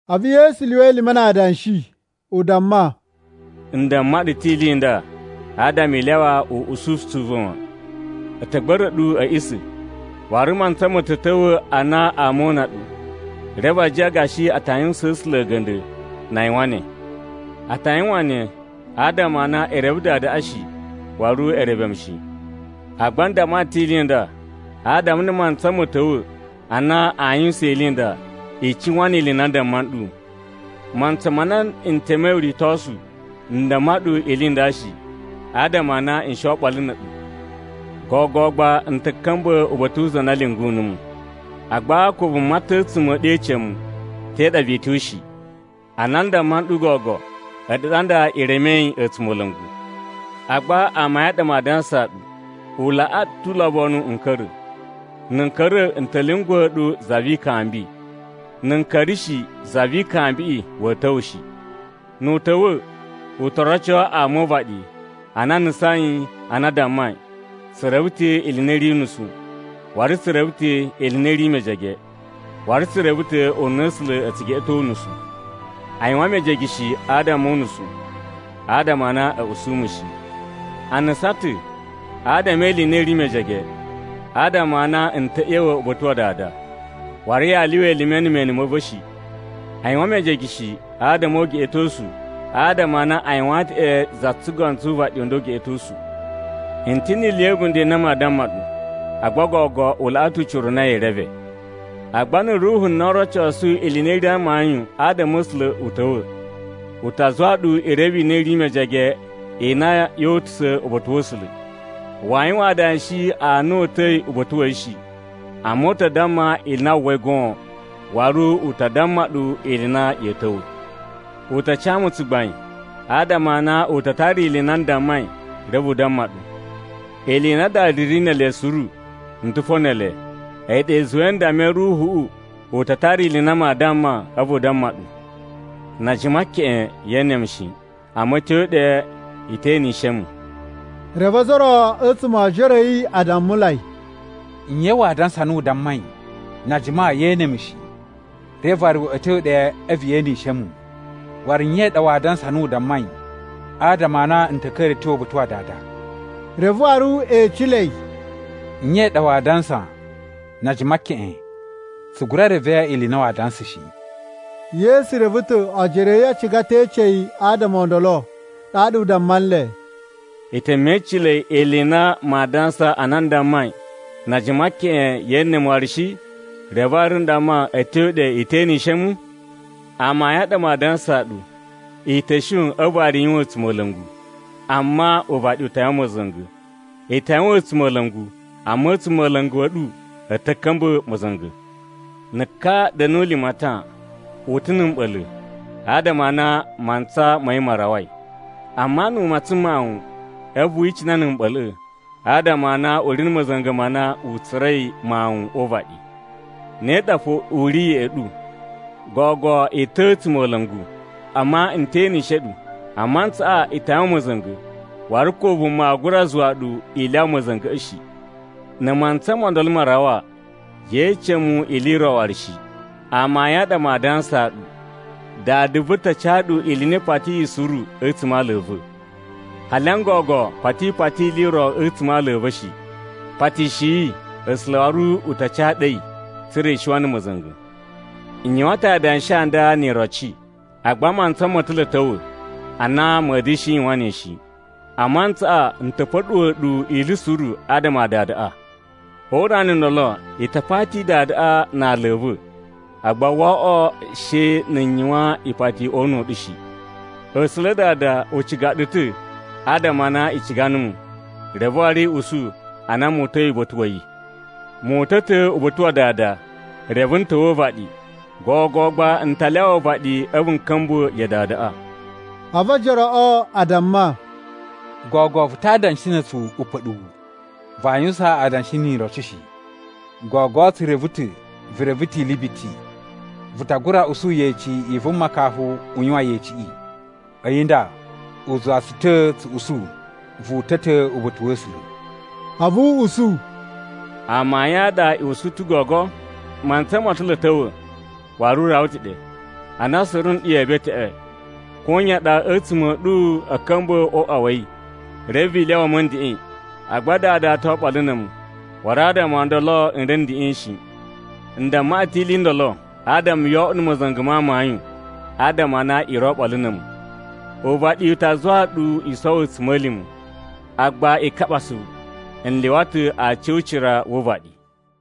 A̱vu Yesu lyuwa elime na adanshi, u damma, “N damma ɗu ta̱ ili i nda, adama i lyawa uꞌususu u va̱ wan. A̱ ta̱ gba̱ra̱ ɗu a̱ a̱ꞌisa̱. Waru mantsa ma̱ ta̱ ta̱wa̱ ana ama oo una ɗu, reve a jiyan gashi a ta yuwusaan A̱sula̱ a̱ga̱nda̱ na a yuwan ne. A ta yuwan ne, adama a na e reve Dadaꞌa shi, waru e reve mu shi. Agba n damma ɗu ta̱ ili i nda, adama na̱ mantsa ma̱ ta̱wa̱ ana aa yuwusan ili i nda, i cuwan ni ili i na n damma nɗu. “Mantsa ma na n temei uritosu, n damma ɗu ili i nda shi, adama a na n shi oɓolo na̱ a̱ɗu. Gogo gba n ta̱ ka̱mba̱ uba̱ta̱ wu za na lyungu numu. Agba ko vuma ta̱ a̱tsuma̱ a̱ ɗu ece mu, ‘Te ɗa vee tyo?’ shi. Ana n damma nɗu gogo, a̱ɗu ɗa nda i remei a̱tsumola̱ngu. Agba amayun a ɗa maa dansaa ɗu, u laꞌaa ɗu ta̱ ulobonu n ka̱ra̱. Na̱ n ka̱ra̱ n ta̱ lyunguwa̱ ɗu na̱ Za vi Ikambi. Na̱ n ka̱ra̱ shi, Za vi Ikambiꞌi wa̱a̱ ta̱wa̱ shi. Nu u ta̱wa̱, u to roco ama o uvaɗi a na a nusain ana a dammai, ‘Tsu reve ta̱ ili i na i ri unusu, waru tsu reve ta̱ ili i na i ri mejege, waru tsu reve ta̱ ununa A̱sula̱ a̱ tsu geꞌeto unusu.’ A yuwan mejege shi adama o unusu, adama a na a̱ usu mu shi. A nusan ta̱ adama e ili i na i ri mejege, adama a na n ta̱ ꞌya̱wa̱ uba̱ta̱ wa Dada, waru yaa lyuwa elime na̱ mene ma̱ va̱ shi. A yuwan mejege shi adama o ugeꞌetosu adama a na u yuwaan ta̱ ɗe za tsugono tsu uvaɗi u nda ugeꞌetosu. “N ta̱ ni ili ya̱ a̱bunda̱ i na maa damma ɗu, agba gogo u laꞌa ta̱ ucira u na yee reve. Agba na̱ Ruhu na o rocosu ili i na i ri amayun adama a̱ A̱sula̱ u ta̱wa̱, u ta zuwa ɗu i reve ili i na i ri mejege i na yoo utusa̱ uba̱ta̱ wa̱ A̱sula̱. Waa yuwan adanshi a na o uta̱i uba̱ta̱ wa̱ yi shi, amma u ta damma ili i na wu uwwai goon, waru u ta damma ɗu ili i na ya̱a̱ ta̱wa̱. U ta ca mu tsugbain, adama a na u ta tara ili i na n dammai reve u damma ɗu. Ili i na Dada ri ne ele suru, n ta̱ fo ne ele. A̱yi ɗa i zuwai n dammai Ruhuꞌu u ta tara ili i na maa damma a̱vu u damma ɗu. “Na a jima keꞌen yee ene mu shi, amma a̱ tyo ɗe i te enishe mu.” Reve ozo o ro a̱tsuma̱ o ojoro a̱ yi a dammulai, “Nye waa dansa ana u dammai, ‘Na a jima yee ene a̱mu shi, reve waru a̱ tyo ɗe a̱vu ye enishe mu?’ Waru nye i ɗa waa dansa ana u dammai, ‘Adama a na n ta̱ ka̱ra̱ a̱ tyo uba̱ta̱ wa Dada?’” Reve waru e ecelei, “Nye i ɗa waa dansa ‘na a jima keꞌen?’ Tsu gura reve ili i na waa dansa shi.” Yesu reve ta̱ ojoro a̱ yi a ciga ta̱ e ece yi adama o ndolo, ɗaɗa u damma nle, “I te mecilei ili i na maa dansa ana n dammai, ‘Na a jima keꞌen ye ene mu waru shi, reve waru n damma a̱ tyo ɗe i te enishe mu?’ Amayun a ɗa maa dansaa ɗu, i ta̱ shon a̱vu waru i yuwan a̱tsumola̱ngu, amma uvaɗi u ta yuwan ma̱za̱nga̱. I ta yuwan a̱tsumola̱ngu, amma a̱tsumola̱ngu a̱ ɗu a̱ ta̱ ka̱mba̱ ma̱za̱nga̱. Na̱ ka da̱nu limatan, u ta̱ na̱ mɓa̱la̱, adama a na mantsa ma̱ yi ma rawai. Amma nu u matsan mawuꞌun, a̱vu wi icina na̱ mɓa̱la̱ꞌa̱ adama a na u ri a̱ ma̱za̱nga̱ ma na u tsura̱i mawun o uvaɗi. Ne ɗa fo u ri ya̱ꞌa̱ ɗu. Gogo i ta̱ a̱tsumola̱ngu, amma n te enishe ɗu. A mantsaꞌa i ta yuwan ma̱za̱nga̱, waru ko vuma aa gura zuwa ɗu i lyawa ma̱za̱nga̱ shi. Na̱ mantsa mo ndolo ma rawa, yee ece mu ili i ro waru shi. Amayun a ɗa maa dansaa ɗu, Dada va̱ ta ca ɗu ili i na i patiyi suru a̱tsuma̱ a ala a̱ va̱. Hali n gogo koto i pati ili i ro a̱tsuma̱ a ala a̱ va̱ shi. Patishiyi, A̱sula̱ waru a ta ca ɗu a̱yi, tsa̱ra̱ i shiwan na̱ ma̱za̱nga̱. “N yuwan ta̱ adanshi a nda ni iroci, agba mantsa mo ta̱ lo a̱ ta̱wa̱ ana ma̱a̱ da̱shi yuwan ne shi. A mantsaꞌa n ta̱ pa̱ɗuwa̱ ɗu ili suru adama a Dadaꞌa. O urana u ndolo i ta pati Dadaꞌa na ala a̱ va̱, agba woo oꞌwo she na̱ n yuwan ipati o una̱ u ɗu shi. A̱sula̱ Dada u ciga ɗu ta̱ adama a na i ciga numu, reve waru i usu a na mu uta̱i uba̱ta̱ wa̱ yi. Mu uta̱ ta̱ uba̱ta̱ wa Dada, reve n ta̱wa̱ o uvaɗi. Gogo gba n ta lyawa uvaɗi a̱vu n ka̱mba̱ ya Dadaꞌa.” A̱vu ojoroꞌo a damma, “Gogo vu ta adanshi na̱ a̱tsu upa̱ɗuwu! Vaa yuwusan adanshi ni iroci shi. Gogo tsu reve ta̱ vu reve ta̱ ili biti. Vu ta gura usu yeci i vuma kafu u yuwan yeciꞌi. A̱yi nda, u zuwa tsu ta̱ tsu usu vu uta̱ ta̱ uba̱ta̱ wa̱ A̱sula̱.” A̱vu u usu, “Amayun a ɗa i usu ta̱ gogo? Mantsa mo ta̱ lo a̱ ta̱wa̱, waru u rawa ta̱ ɗe, ana suru nɗu yee beteꞌwe, koyan ɗa a̱tsuma̱ a̱ ɗu a̱ ka̱mba̱ o uꞌwa wa̱ yi, reve i lyawa mu a̱ ndeꞌen. Agba Dada to oɓolo na̱ a̱mu, waru adama o ndolo n ri a̱ ndeꞌen shi. “N damma ɗu ta̱ ili i ndolo adama yoo oꞌwo na̱ ma̱za̱nga̱ ma amayun adama a na i ri oɓolo na̱ a̱mu. Uvaɗi u ta zuwa ɗu i sowo a̱tsuma̱lima̱. Agba i kaɓa asuvu! N lyuwa ta̱ aci o ucira wu uvaɗi!”